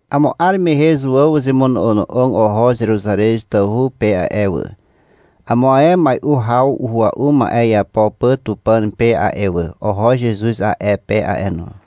Amo 'ar mehe Zutew uzemono'ono'og oho Zeruzarez tawhu pe a'e wà, amo ae mai'u haw uhua'u ma'e iapo pà Tupàn pe a'e wà. Oho Zezuz a'e pe a'e no.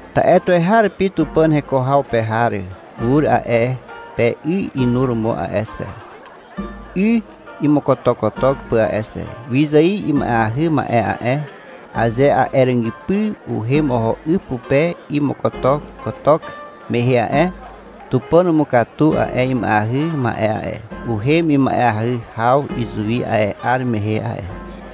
Ta'e tuweharupi Tupàn heko haw pe har ur a'e pe 'y inuromo a'e xe, 'y imokotokotok pà a'e xe. Wyzài ima'eahy ma'e a'e, aze a'e ràgypy uhem oho 'y pupe imokotokotok mehe a'e, Tupàn umukatu a'e ima'eahy ma'e a'e. Uhem ima'eahy haw izuwi a'e 'ar mehe a'e.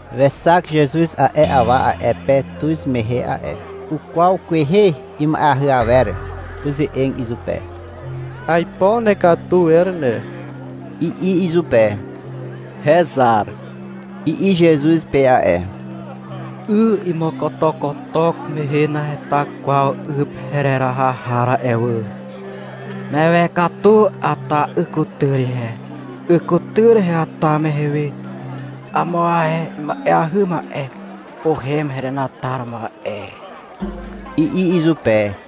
Wexak Zezuz a'e awa a'e pe tuz mehe a'e. Ukwaw kwehe ima'eahy awer. Uze'eg izupe. — Aipo nekatu wer ne, i'i izupe. — Hezar, i'i Zezuz pe a'e. — 'Y imokotokotok mehe naheta kwaw 'y pe hereraha har a'e wà. Mewe katu ata 'y kutyr ihe. 'Y kutyr heata mehe we, amo ae ima'eahy ma'e uhem herenataromo a'e, i'i izupe.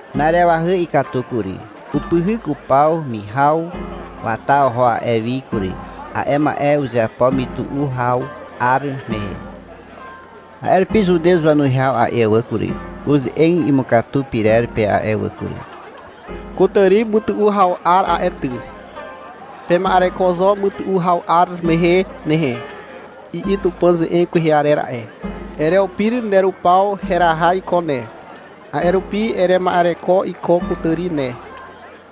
Na'arewahy ikatu kury. Upyhyk upaw mihaw. Wata oho a'e wi kury. A'e ma'e uzeapo mytu'u haw 'ar mehe. A'e rupi Zutew wanuwihaw a'e wà kury, uze'eg imukatu pyrer pe a'e wà kury. — Kutàri mytu'u haw 'ar a'e ty. — Pema'ereko zo mytu'u haw 'ar mehe nehe, i'i Tupàn ze'eg kwehe arer a'e. Ereupir nerupaw heraha iko ne, a'e rupi erema'ereko iko kutàri ne,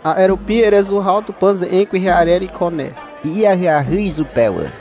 a'e rupi erezuhaw Tupàn ze'eg kwehe arer iko ne, i'i ahyahy izupe wà.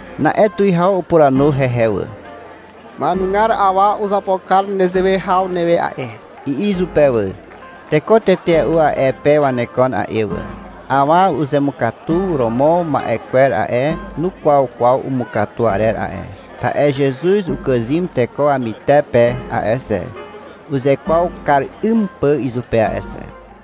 Na'e tuwihaw upuranu hehe wà. — Ma'enugar awa uzapo kar nezewe haw newe a'e, i'i izupe wà. Teko tetea'u a'e pe wanekon a'e wà. Awa uzemukatu romo ma'e kwer a'e, nukwaw kwaw umukatu arer a'e, ta'e Zezuz ukàzym teko wamytepe a'e xe, uzekwaw kar 'ym pà izupe a'e xe.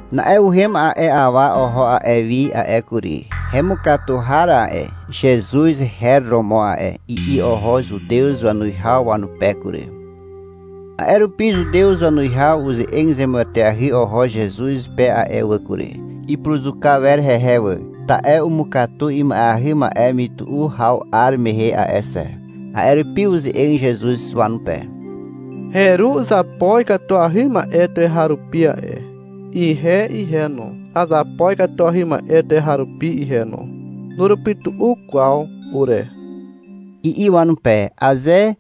Na'e uhem a'e awa oho a'e wi a'e kury. — Hemukatu har a'e, Zezuz her romo a'e, i'i oho Zutew wanuwihaw wanupe kury. A'e rupi Zutew wanuwihaw uze'eg zemueteahy oho Zezuz pe a'e wà kury. Ipuruzuka wer hehe wà, ta'e umukatu ima'eahy ma'e mytu'u haw 'ar mehe a'e xe. A'e rupi uze'eg Zezuz wanupe. — Heru uzapo ikatuahy ma'e tuweharupi a'e. Ihe ihe no, azapo ikatuahy ma'e tuweharupi ihe no. Nurupytu'u kwaw ure, i'i wanupe. A'e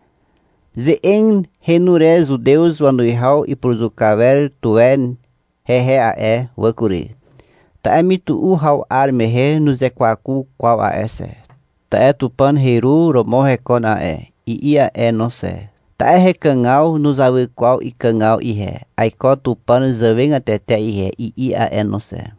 ze'eg henu re Zutew wanuwihaw ipuruzuka wer tuwe hehe a'e wà kury, ta'e mytu'u haw 'ar mehe nuzekwaku kwaw a'e xe, ta'e — Tupàn heru romo hekon a'e, i'i a'e no xe, ta'e — Hekàgaw nuzawy kwaw ikàgaw ihe, aiko Tupàn zàwegatete ihe, i'i a'e no xe.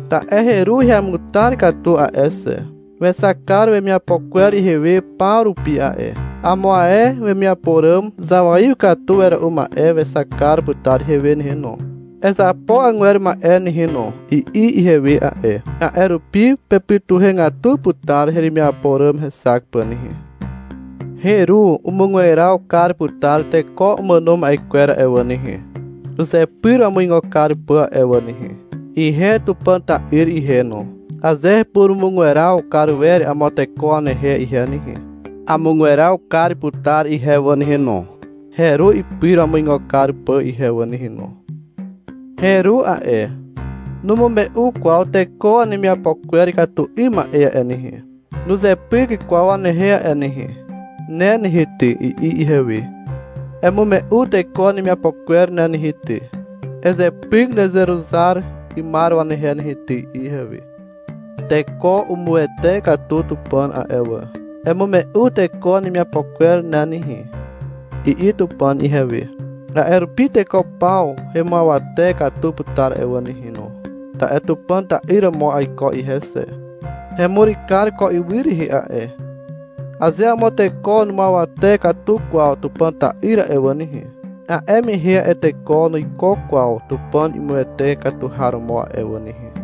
Ta'e heru heamutar katu a'e xe. Wexak kar wemiapo kwer ihewe paw rupi a'e. Amo ae wemiapo ràm zawaiw katu wera'u ma'e wexak kar putar ihewe nehe no. — Ezapo agwer ma'e ne nehe no, i'i ihewe a'e. A'e rupi pepytuhegatu putar heremiapo ràm hexak pà nehe. Heru umugweraw kar putar teko umàno ma'e kwer a'e wà nehe, uzepyr wamuigo kar pà a'e wà nehe. Ihe Tupàn ta'yr ihe no, aze hepurumugweraw kar wer amo teko wanehe ihe nehe, amugweraw kar putar ihe wà nehe no, heru ipyr wamuigo kar pà ihe wà nehe no. Heru a'e, numume'u kwaw teko wanemiapo kwer ikatu 'ym ma'e a'e nehe, nuzepyk kwaw wanehe a'e nehe. — Ne nehe ty, i'i ihewe, — Emume'u teko wanemiapo kwer ne nehe ty, ezepyk nereruzar 'ymar wanehe nehe ty, i'i ihewe. Teko umuwete katu Tupàn a'e wà. — Emume'u teko wanemiapo kwer ne nehe, i'i Tupàn ihewe. A'e rupi teko paw hemuawate katu putar a'e wà nehe no. Ta'e Tupàn ta'yr romo aiko ihe xe. Hemur kar ko ywy rehe a'e. Aze amo teko numuawate katu kwaw Tupàn ta'yr a'e wà nehe, a'e mehe a'e teko nuiko kwaw Tupàn imuwete katu har romo a'e wà nehe.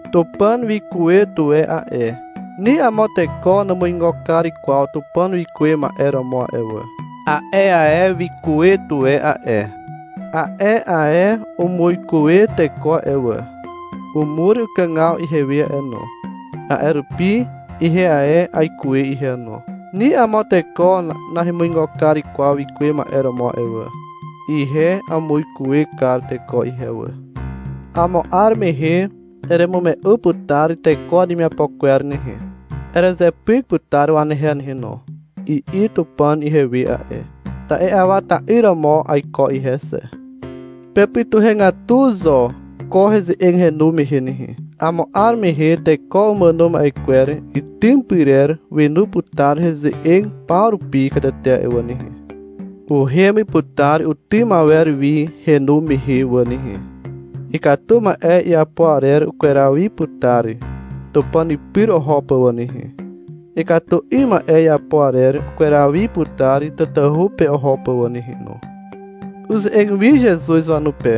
Tupàn wikuwe tuwe a'e. Ni amo teko numuigo kar kwaw Tupàn wikuwe ma'e romo a'e wà. A'e ae wikuwe tuwe a'e. A'e ae umuikuwe teko a'e wà. Umur ukàgaw ihewe a'e no. A'e rupi ihe ae aikuwe ihe no. Ni amo teko nahemuigo kar kwaw wikuwe ma'e romo a'e wà. Ihe amuikuwe kar teko ihe wà. — Amo 'ar mehe eremume'u putar teko wanemiapo kwer nehe, erezepyk putar wanehe nehe no, i'i Tupàn ihewe a'e. Ta'e Awa ta'yr romo aiko ihe xe. Pepytuhegatu zo ko heze'eg henu mehe nehe. Amo 'ar mehe teko umàno ma'e kwer itym pyrer wenu putar heze'eg paw rupi katete a'e wà nehe. Uhem putar utym awer wi henu mehe wà nehe. Ikatu ma'e iapo arer ukweraw wi putar Tupàn pyr oho pà wà nehe. Ikatu 'ym ma'e iapo arer ukweraw wi putar tatahu pe oho pà wà nehe no. Uze'eg wi Zezuz wanupe.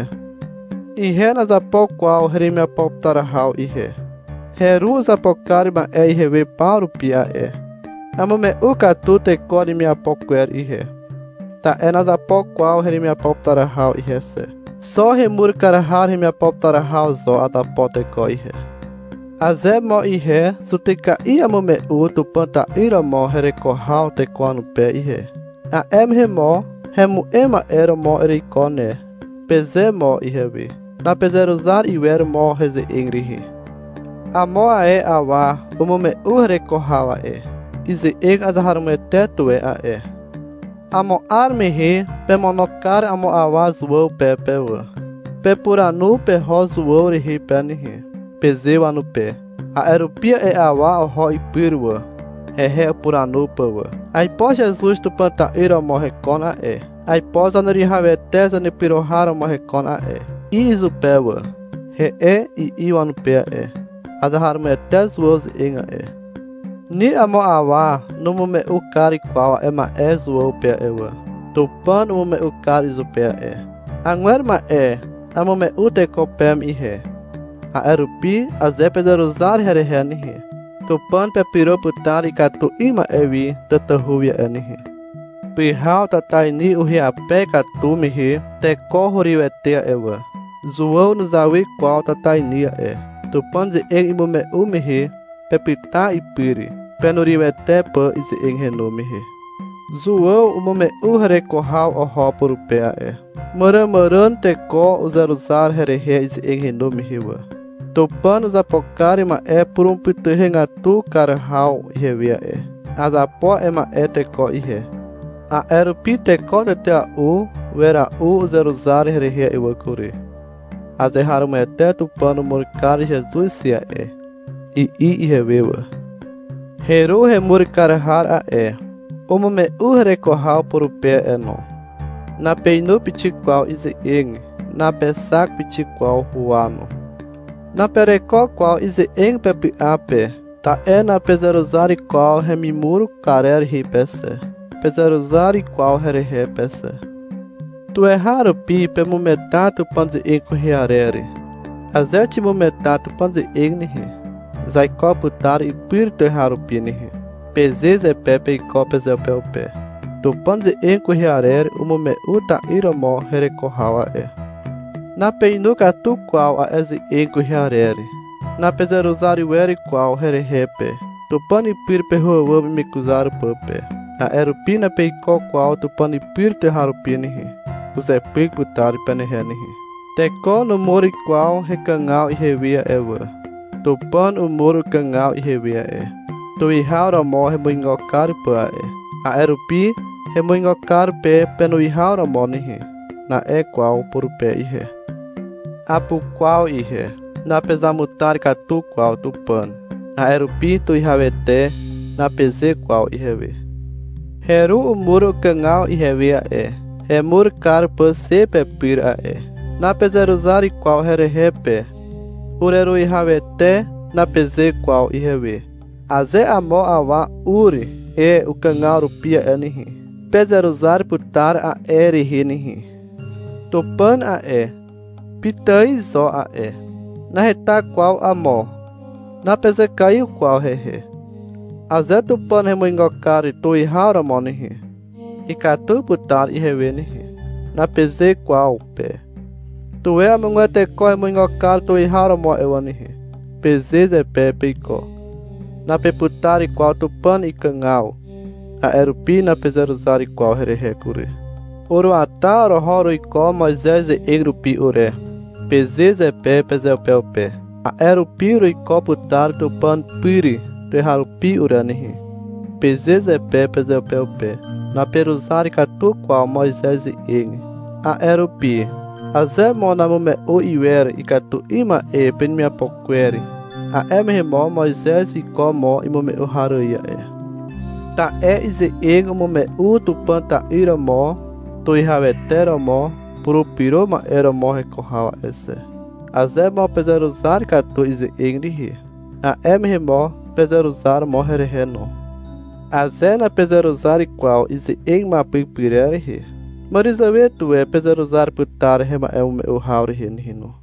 — Ihe nazapo kwaw heremiapo putar haw ihe. Heru uzapo kar ma'e ihewe paw rupi a'e. Amume'u katu teko wanemiapo kwer ihe, ta'e nazapo kwaw heremiapo putar haw ihe xe. Xo hemur kar har hemiapo putar haw zo azapo teko ihe. Aze mo ihe zutyka'i amume'u Tupàn ta'yr romo hereko haw teko wanupe ihe, a'e mehe mo, — Hemu'em ma'e romo ereiko ne, peze mo ihewe. Napezeruzar iwer mo heze'eg rehe. Amo ae awa umume'u hereko haw a'e. Ize'eg azeharomoete tuwe a'e. Amo 'ar mehe pemono kar amo awa Zuàw pe pe wà. — Pepuranu peho Zuàw rehe pe nehe, peze wanupe. A'e rupi a'e awa oho ipyr wà, hehe upuranu pà wà. — Aipo Zezuz Tupàn ta'yr romo hekon a'e, aipo Zaneruwihawete Zanepyro har romo hekon a'e, i'i izupe wà. — He'e, i'i wanupe a'e. Azeharomoete Zuàw ze'eg a'e. Ni amo awa numume'u kar kwaw a'e ma'e Zuàw pe a'e wà. Tupàn umume'u kar izupe a'e. Agwer ma'e amume'u teko peme ihe, a'e rupi aze pezeruzar herehe nehe, Tupàn pepyro putar ikatu 'ym ma'e wi tatahu wi a'e nehe. Pyhaw tatainy ihyape katu mehe teko hurywete a'e wà. Zuàw nuzawy kwaw tatainy a'e. Tupàn ze'eg imume'u mehe pepyta ipyr, penurywete pà ize'eg henu mehe. Zuàw umume'u hereko haw oho purupe a'e. Màràmàràn teko uzeruzar herehe ize'eg henu mehe wà. Tupàn uzapo kar ma'e purumupytuhegatu kar haw ihewe a'e. Azapo a'e ma'e teko ihe. A'e rupi teko tetea'u wera'u uzeruzar herehe a'e wà kury. — Azeharomoete Tupàn umur kar Zezuz xe a'e, i'i ihewe wà. Heru hemur kar har a'e, umume'u hereko haw purupe a'e no. Napeinu pixik kwaw ize'eg. Napexak pixik kwaw huwa no. Napereko kwaw ize'eg pepy'a pe, ta'e napezeruzar kwaw hemimur karer rehe pe xe, napezeruzar kwaw herehe pe xe. Tuweharupi pemugeta Tupàn ze'eg kwehe arer. — Aze ximugeta Tupàn ze'eg nehe, zaiko putar ipyr tuweharupi nehe, peze zepe peiko pezeupeupe. Tupàn ze'eg kwehe arer umume'u ta'yr romo hereko haw a'e. Napeinu katu kwaw a'e ze'eg kwehe arer. Napezeruzar wer kwaw herehe pe, Tupàn pyr peho àwàm imekuzar pà pe. (A'e rupi napeiko kwaw Tupàn pyr tuweharupi nehe. Uzepyk putar penehe nehe.) Teko numur kwaw hekàgaw ihewe a'e wà. Tupàn umur ukàgaw ihewe a'e, tuwihaw romo hemuigo kar pà a'e. A'e rupi, — Hemuigo kar pe penuwihaw romo nehe, na'e kwaw purupe ihe. Apukwaw ihe. Napezamutar katu kwaw Tupàn. (A'e rupi — Tuwihawete, napeze kwaw ihewe.) Heru umur ukàgaw ihewe a'e, hemur kar pà xe pepyr a'e. Napezeruzar kwaw herehe pe. — Ureruwihawete, napeze kwaw ihewe. Aze amo awa ur e ukàgaw rupi a'e nehe, pezeruzar putar a'e rehe nehe. Tupàn a'e, pitài zo a'e, naheta kwaw amo. Napezekaiw kwaw hehe. — Aze Tupàn hemuigo kar tuwihaw romo nehe, ikatu putar ihewe nehe, napeze kwaw pe. — Tuwe amogwer teko hemuigo kar tuwihaw romo a'e wà nehe, peze zepe peiko. Napeputar kwaw Tupàn ikàgaw, a'e rupi napezeruzar kwaw herehe kury. — Uruata oroho uruiko Moizez ze'eg rupi ure, peze zepe pezeupeupe. — A'e rupi uruiko putar Tupàn pyr tuweharupi ure nehe, peze zepe pezeupeupe. Naperuzar katu kwaw Moizez ze'eg. A'e rupi, aze mo namume'u iwer ikatu 'ym ma'e penemiapo kwer, a'e mehe mo Moizez wiko mo imume'u har ài a'e. Ta'e ize'eg umume'u Tupàn ta'yr romo Tuwihawete romo purupyro ma'e romo hereko haw a'e xe. Aze mo pezeruzar katu ize'eg rehe, a'e mehe mo pezeruzar mo herehe no. Aze napezeruzar kwaw ize'eg imuapyk pyrer rehe, màràzàwe tuwe pezeruzar putar hema'emume'u haw rehe nehe no.